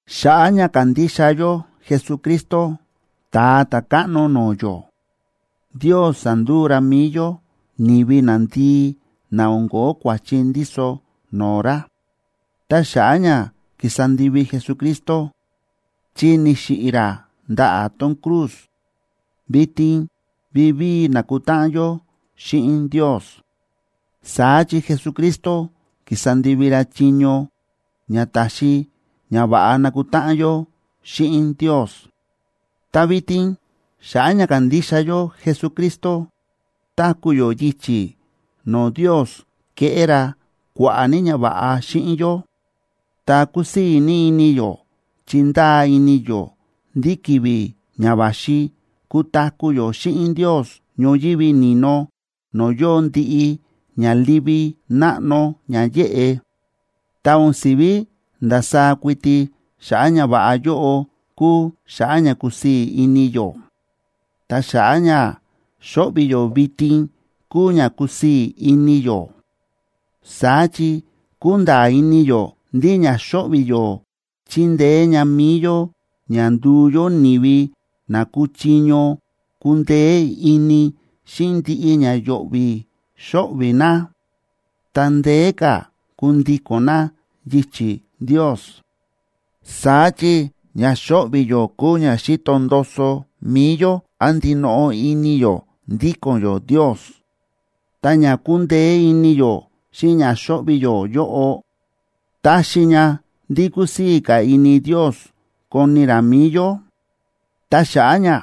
Xa̱ꞌa̱ ña kándixa yó Jesucristo, Ta̱a Ta̱káꞌno no̱o̱ yó, Ndios sa̱nduu ra mi̱i yó ni̱vi nandii na o̱n ko̱ó kua̱chi ndíso no̱o̱ ra. Ta xa̱ꞌa̱ ña ki̱sa ndivi Jesucristo, chi ni̱xiꞌi̱ ra ndaꞌa̱ tón cruz, vitin vivíi nákutáꞌan yó xíꞌin Ndios. Saá chi Jesucristo ki̱sa ndivi ra chiño ña táxi ña va̱ꞌa nakutáꞌan yó xíꞌin Ndios. Ta vitin xa̱ꞌa̱ ña kándixa yó Jesucristo, táku̱ yó yichi̱ no̱o̱ Ndios kéꞌé ra kua̱ꞌa̱ ní ñava̱ꞌa xíꞌin yó, ta kúsii̱ ní ini yó chi ndáa ini yó ndí ki̱vi̱ ña va̱xi kutaku̱ yó xíꞌin Ndios ñoyívi ni̱no no̱o̱ yóo ndiꞌi ña livi náꞌno ña yéꞌe. Ta o̱n si̱ví ndasaá kuiti xa̱ꞌa̱ ñava̱ꞌa yóꞌo kúu xa̱ꞌa̱ ña kúsii̱ ini yó, ta xa̱ꞌa̱ ña xóꞌvi̱ yó vitin kúu ña kúsii̱ ini yó. Saá chi kúnda̱a̱ ini yó ndí ña xóꞌvi̱ yó chíndeé ña mi̱i yó ña nduu yó ni̱vi na kúchiño kundeé ini xíꞌin ndiꞌi ña yo̱ꞌvi̱ xóꞌvi̱ na, ta ndeé ka̱ kundíko̱n na yichi̱ Ndios. Saá chi ña xóꞌvi̱ yó kúu ña xíto ndoso mi̱i yó án ndinoꞌo ini yó ndíko̱n yó Ndios. Ta ña kúndeé ini yó xíꞌin ña xóꞌvi̱ yó yóꞌo, táxi ña ndí kusii̱ ka̱ ini Ndios koni ra mi̱i yó. Ta xa̱ꞌa̱ ña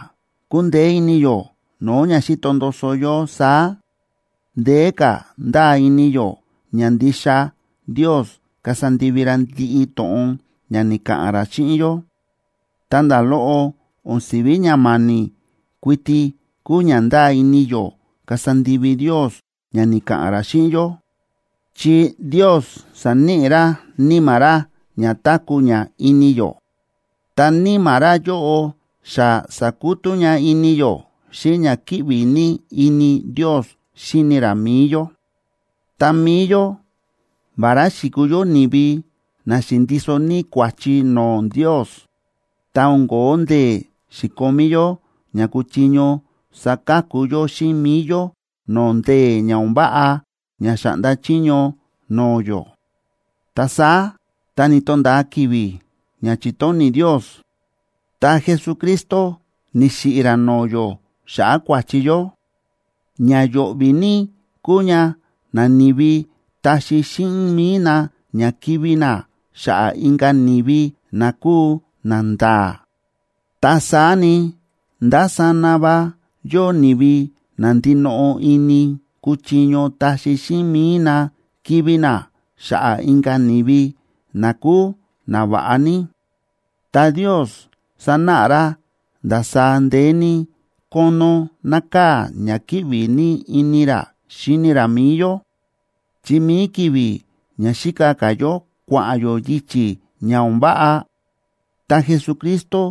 kúndeé ini yó no̱o̱ ña xíto ndoso yó saá, ndeé ka̱ ndáa ini yó ña ndixa Ndios kasa ndivi ra ndiꞌi to̱ꞌon ña ni̱ka̱ꞌa̱n ra xíꞌin yó. Ta nda̱ loꞌo o̱n si̱ví ña ma̱ni̱ kuiti kúu ña ndáa ini yó kasa ndivi Ndios ña ni̱ka̱ꞌa̱n ra xíꞌin yó, chi Ndios sa̱níꞌi ra Níma̱ ra ña táku̱ ña ini yó, ta Níma̱ ra yóꞌo xa sa̱kutú ña ini yó xíꞌin ña kíꞌvi ní ini Ndios xíni ra mi̱i yó. Ta mi̱i yó, vará xi̱kuu yó ni̱vi na xi̱ndiso ní kua̱chi no̱o̱ Ndios, ta o̱n ko̱ó ndee̱ xi̱komí yó ña kuchiño saka̱ku yó xíꞌin mi̱i yó no̱o̱ ndee̱ ña o̱n váꞌa ña xa̱ꞌnda chiño no̱o̱ yó, ta saá tá ni̱to̱nda̱a ki̱vi̱ ña chi̱tóni̱ Ndios, ta Jesucristo ni̱xiꞌi̱ ra no̱o̱ yó xa̱ꞌa̱ kua̱chi yó. Ña yo̱ꞌvi̱ ní kúu ña nani̱vi taxi xíꞌin mi̱i na ña kivi̱ na xa̱ꞌa̱ inka̱ ni̱vi na kúu nanda̱a̱. Ta saá ni, ndásana va yóo ni̱vi na ndinoꞌo ini kuchiño taxi xíꞌin mi̱i na kivi̱ na xa̱ꞌa̱ inka̱ ni̱vi, na kúu nava̱ꞌa ní. Ta Ndios sánáꞌa ra ndasaá ndeé ní kónó nákaa̱ ña kíꞌvi ní ini ra xíni ra mi̱i yó, chi mi̱i ki̱vi̱ ña xíka ka̱ yó kua̱ꞌa̱n yó yichi̱ ña o̱n váꞌa, ta Jesucristo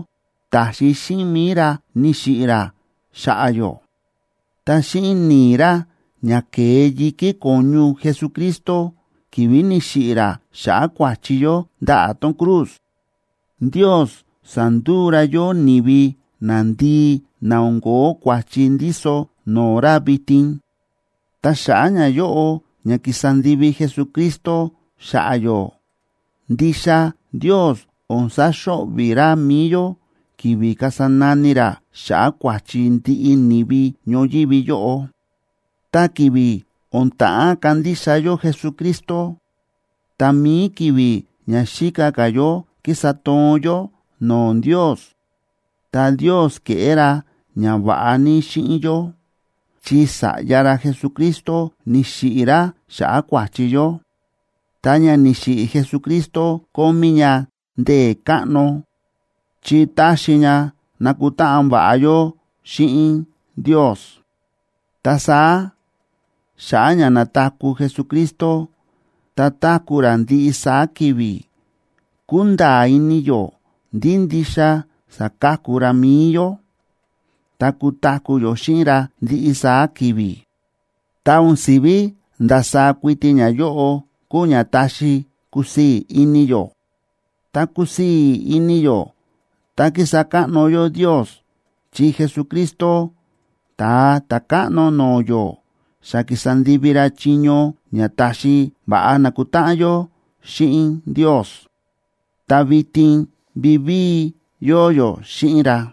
ta̱xi xíꞌin mi̱i ra ni̱xiꞌi̱ ra xa̱ꞌa̱ yó. Ta xíꞌin ni̱i̱ ra ña ke̱e yi̱kí ko̱ñu Jesucristo ki̱vi̱ ni̱xiꞌi̱ ra xa̱ꞌa̱ kua̱chi yó ndaꞌa̱ tón cruz, Ndios sa̱nduu ra yó ni̱vi nandii na o̱n ko̱ó kua̱chi ndíso no̱o̱ ra vitin. Ta xa̱ꞌa̱ ñayóꞌo ña ki̱sa ndivi Jesucristo xa̱ꞌa̱ yó, ndixa Ndios o̱n saxo̱ꞌvi̱ ra mi̱i yó, ki̱vi̱ kasa nani ra xa̱ꞌa̱ kua̱chi ndiꞌi ni̱vi ñoyívi yóꞌo. Ta ki̱vi̱ o̱n ta̱ꞌán kandixa yó Jesucristo, ta mi̱i ki̱vi̱ ña xíka ka̱ yó kísa toon yó no̱o̱ Ndios, ta Ndios ke̱ꞌé ra ñava̱ꞌa ní xíꞌin yó, chi Sa̱ꞌya ra Jesucristo ni̱xiꞌi̱ ra xa̱ꞌa̱ kua̱chi yó. Ta ña ni̱xiꞌi̱ Jesucristo kómí ña ndee̱ káꞌno, chi ta̱xi ña na̱kutáꞌan va̱ꞌa yó xíꞌin Ndios. Ta saá xa̱ꞌa̱ ña na̱taku̱ Jesucristo ta táku̱ ra ndiꞌi saá ki̱vi̱, kúnda̱a̱ ini yó ndí ndixa saka̱ku ra mi̱i yó, ta kutaku̱ yó xíꞌin ra ndiꞌi saá ki̱vi̱. Ta o̱n si̱ví ndasaá kuiti ñayóꞌo kúu ña táxi kusii̱ ini yó. Ta kúsii̱ ini yó ta kísa káꞌno yó Ndios chi Jesucristo, Ta̱a Ta̱káꞌno no̱o̱ yó, xa ki̱sa ndivi ra chiño ña ta̱xi va̱ꞌa nákutáꞌan yó xíꞌin Ndios, ta vitin vivíi yóo yó xíꞌin ra.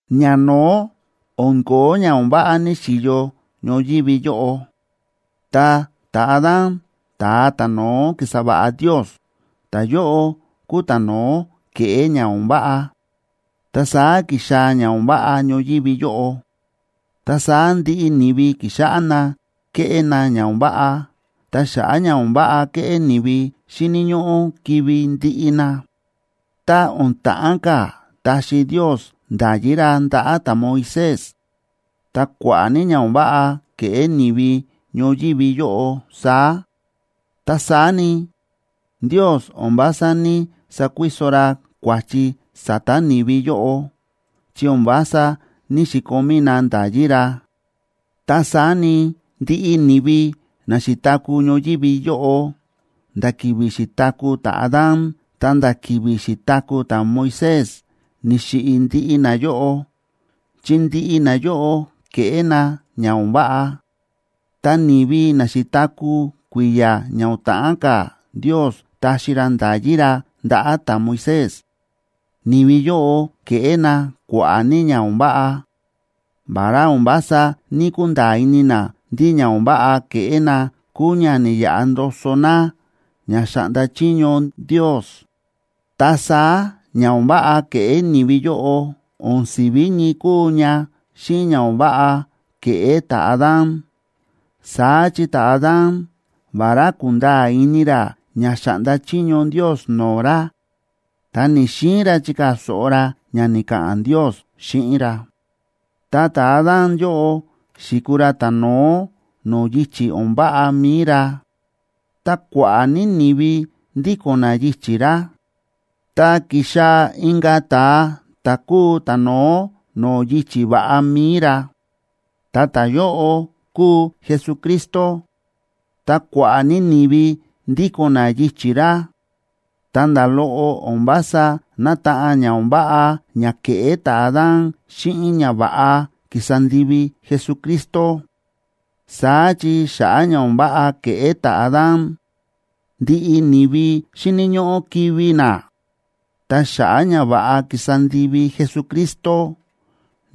Ñano̱ó o̱n ko̱ó ña o̱n váꞌa ni̱xi̱yo ñoyívi yóꞌo. Ta ta̱Adán, ta̱a ta̱no̱ó ki̱sa va̱ꞌa Ndios, ta̱yóꞌo kúu ta̱no̱ó ke̱ꞌé ña o̱n váꞌa, ta saá ki̱xaa̱ ña o̱n váꞌa ñoyívi yóꞌo. Ta saá ndiꞌi ni̱vi ki̱xáꞌá na kéꞌé na ña o̱n váꞌa, ta xa̱ꞌa̱ ña o̱n váꞌa kéꞌé ni̱vi, xíni̱ ñóꞌó kivi̱ ndiꞌi na. Tá o̱n ta̱ꞌán ka̱ taxi Ndios nda̱yí ra ndaꞌa̱ ta̱Moisés, ta kua̱ꞌa̱ ní ña o̱n váꞌa ke̱ꞌé ni̱vi ñoyívi yóꞌo saá. Ta saá ni, Ndios o̱n vása ní‑sakuiso ra kua̱chi sa̱ta̱ ni̱vi yóꞌo, chi o̱n vása ní‑xikomí na nda̱yí ra. Ta saá ni, ndiꞌi ni̱vi na xi̱taku̱ ñoyívi yóꞌo, nda̱ ki̱vi̱ xi̱taku̱ ta̱Adán ta̱nda̱ ki̱vi̱ xi̱taku̱ ta̱Moisés, ni̱xiꞌi̱ ndiꞌi nayóꞌo, chi ndiꞌi nayóꞌo ke̱ꞌé na ña o̱n váꞌa. Ta ni̱vi na xi̱taku̱ kui̱ya̱ ña o̱n ta̱ꞌán ka̱ Ndios taxi ra nda̱yí ra ndaꞌa̱ ta̱Moisés, ni̱vi yóꞌo ke̱ꞌé na kua̱ꞌa̱ ní ña o̱n váꞌa, vará o̱n vása ní‑kunda̱a̱ ini na ndí ña o̱n váꞌa ke̱ꞌé na kúu ña ni̱yaꞌa ndoso na ña xa̱ꞌnda chiño Ndios. Ta saá ña o̱n váꞌa ke̱ꞌé ni̱vi yóꞌo o̱n si̱ví ñii kúu ña xíꞌin ña o̱n váꞌa ke̱ꞌé ta̱Adán. Saá chi ta̱Adán, vará ku̱nda̱a̱ ini ra ña xa̱ꞌnda chiño Ndios no̱o̱ ra, ta ni̱‑xiin ra chikaa̱ so̱ꞌo ra ña ni̱ka̱ꞌa̱n Ndios xíꞌin ra. Ta ta̱Adán yóꞌo xi̱kuu ra ta̱no̱ó no̱o̱ yichi̱ o̱n váꞌa mi̱i ra, ta kua̱ꞌa̱ ní ni̱vi ndíko̱n na yichi̱ ra. Ta ki̱xaa̱ inka̱ ta̱a ta̱ kúu ta̱no̱ó no̱o̱ yichi̱ va̱ꞌa mi̱i ra, ta ta̱yóꞌo kúu Jesucristo, ta kua̱ꞌa̱ ní ni̱vi ndíko̱n na yichi̱ ra. Ta nda̱ loꞌo o̱n vása nátaꞌan ña o̱n váꞌa ña ke̱ꞌé ta̱Adán xíꞌin ñava̱ꞌa ki̱sa ndivi Jesucristo. Saá chi xa̱ꞌa̱ ña o̱n váꞌa ke̱ꞌé ta̱Adán, ndiꞌi ni̱vi xíni̱ ñóꞌó kivi̱ na. Ta xa̱ꞌa̱ ñava̱ꞌa ki̱sa ndivi Jesucristo,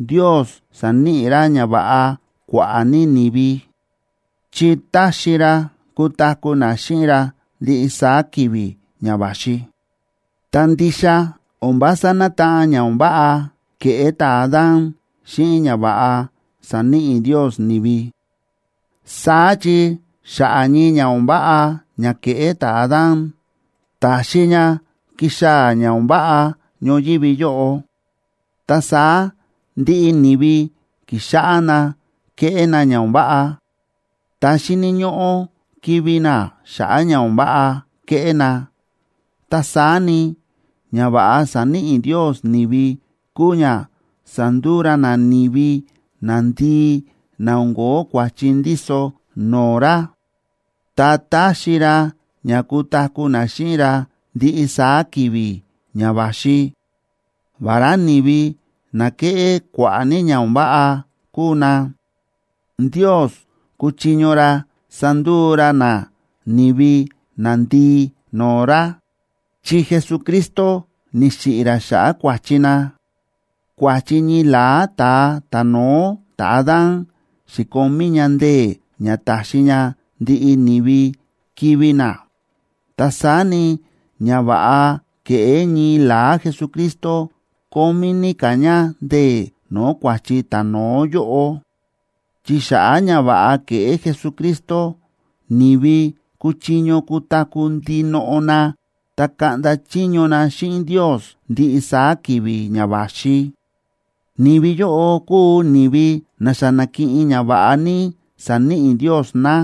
Ndios sa̱níꞌi ra ñava̱ꞌa kua̱ꞌa̱ ní ni̱vi, chi táxi ra kutaku̱ na xíꞌin ra ndiꞌi saá ki̱vi̱ ña va̱xi. Ta ndixa o̱n vása nátaꞌan ña o̱n váꞌa ke̱ꞌé ta̱Adán xíꞌin ñava̱ꞌa sáníꞌi Ndios ni̱vi. Saá chi xa̱ꞌa̱ ñii ña o̱n váꞌa ña ke̱ꞌé ta̱Adán, ta̱xi ña ki̱xaa̱ ña o̱n váꞌa ñoyívi yóꞌo, ta saá ndiꞌi ni̱vi ki̱xáꞌá na kéꞌé na ña o̱n váꞌa, ta xíni̱ ñóꞌó kivi̱ na xa̱ꞌa̱ ña o̱n váꞌa kéꞌé na. Ta saá ni, ñava̱ꞌa sa̱níꞌi Ndios ni̱vi kúu ña sánduu ra na ni̱vi nandii na o̱n ko̱ó kua̱chi ndíso no̱o̱ ra, ta táxi ra ña kutaku̱ na xíꞌin ra ndiꞌi saá ki̱vi̱ ña va̱xi. Vará ni̱vi na ke̱ꞌé kua̱ꞌa̱ ní ña o̱n váꞌa kúu na, Ndios kúchiño ra sanduu ra na ni̱vi nandii no̱o̱ ra, chi Jesucristo ni̱xiꞌi̱ ra xa̱ꞌa̱ kua̱chi na. Kua̱chi ñii la̱á ta̱a ta̱no̱ó ta̱Adán xi̱komí ña ndee̱ ña táxi ña ndiꞌi ni̱vi kivi̱ na. Ta saá ni, ñava̱ꞌa ke̱ꞌé ñii la̱á Jesucristo kómí ní ka̱ ña ndee̱ no̱o̱ kua̱chi ta̱no̱ó yóꞌo, chi xa̱ꞌa̱ ñava̱ꞌa ke̱ꞌé Jesucristo, ni̱vi kuchiño kutaku̱ ndinoꞌo na ta kaꞌnda chiño na xíꞌin Ndios ndiꞌi saá ki̱vi̱ ña va̱xi. Ni̱vi yóꞌo kúu ni̱vi na xa na̱kiꞌin ñava̱ꞌa ní sa̱níꞌi Ndios na,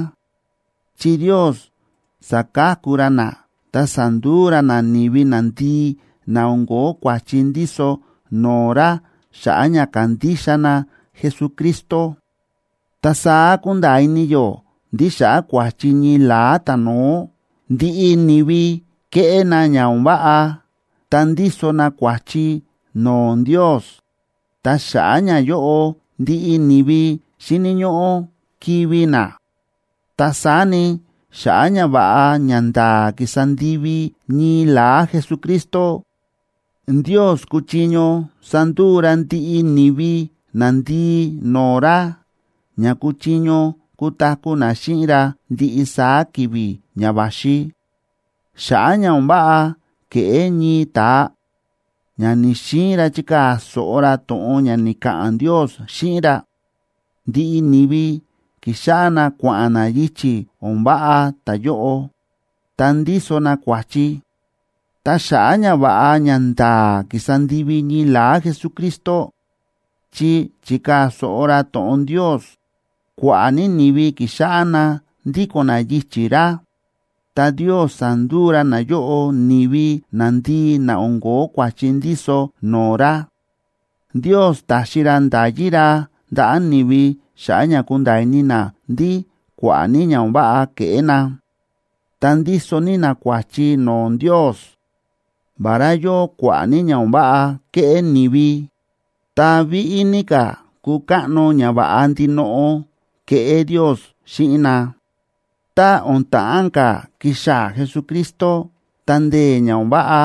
chi Ndios sa̱ka̱ku ra na, ta sa̱nduu ra na ni̱vi nandii na o̱n ko̱ó kua̱chi ndíso no̱o̱ ra xa̱ꞌa̱ ña kándixa na Jesucristo. Ta saá kúnda̱a̱ ini yó ndí xa̱ꞌa̱ kua̱chi ñii la̱á ta̱no̱ó, ndiꞌi ni̱vi kéꞌé na ña o̱n váꞌa, ta ndíso na kua̱chi no̱o̱ Ndios. Ta xa̱ꞌa̱ ñayóꞌo ndiꞌi ni̱vi xíni̱ ñóꞌó kivi̱ na. Ta saá ni, xa̱ꞌa̱ ñava̱ꞌa ñanda̱a̱ ki̱sa ndivi ñii la̱á Jesucristo, Ndios kuchiño sanduu ra ndiꞌi ni̱vi nandii no̱o̱ ra, ña kuchiño kutaku̱ na xíꞌin ra ndiꞌi saá ki̱vi̱ ña va̱xi. Xa̱ꞌa̱ ña o̱n váꞌa ke̱ꞌé ñii ta̱a, ña ni̱‑xiin ra chikaa̱ so̱ꞌo ra to̱ꞌon ña ni̱ka̱ꞌa̱n Ndios xíꞌin ra, ndiꞌi ni̱vi ki̱xáꞌá na kua̱ꞌa̱n na yichi̱ o̱n váꞌa ta̱yóꞌo, ta ndíso na kua̱chi. Ta xa̱ꞌa̱ ñava̱ꞌa ñanda̱a̱ ki̱sa ndivi ñii la̱á Jesucristo, chi chi̱kaa̱ so̱ꞌo ra to̱ꞌon Ndios, kua̱ꞌa̱ ní ni̱vi ki̱xáꞌá na ndíko̱n na yichi̱ ra, ta Ndios sa̱nduu ra nayóꞌo ni̱vi nandii na o̱n ko̱ó kua̱chi ndíso no̱o̱ ra. Ndios ta̱xi ra nda̱yí ra ndaꞌa̱ ni̱vi xa̱ꞌa̱ ña kunda̱a̱ ini na ndí kua̱ꞌa̱ ní ña o̱n váꞌa kéꞌé na, ta ndíso ní na kua̱chi no̱o̱ Ndios. Vará yóo kua̱ꞌa̱ ní ña o̱n váꞌa kéꞌé ni̱vi, ta víꞌí ní ka̱ ku̱káꞌno ñava̱ꞌa ndinoꞌo ke̱ꞌé Ndios xíꞌin na. Ta o̱n ta̱ꞌán ka̱ kixaa̱ Jesucristo, ta ndee̱ ña o̱n váꞌa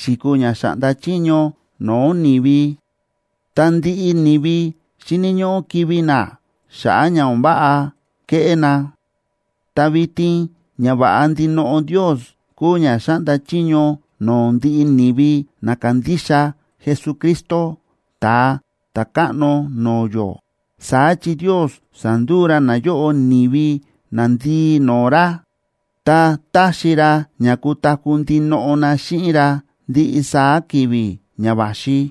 xi̱kuu ña xa̱ꞌnda chiño no̱o̱ ni̱vi, ta ndiꞌi ni̱vi xíni̱ ñóꞌó kivi̱ na xa̱ꞌa̱ ña o̱n váꞌa kéꞌé na. Ta vitin ñava̱ꞌa ndinoꞌo Ndios kúu ña xáꞌnda chiño no̱o̱ ndiꞌi ni̱vi na kándixa Jesucristo, Ta̱a Ta̱káꞌno no̱o̱ yó. Saá chi Ndios sa̱nduu ra nayóꞌo ni̱vi nandii no̱o̱ ra, ta táxi ra ña kutaku̱ ndinoꞌo na xíꞌin ra ndiꞌi saá ki̱vi̱ ña va̱xi.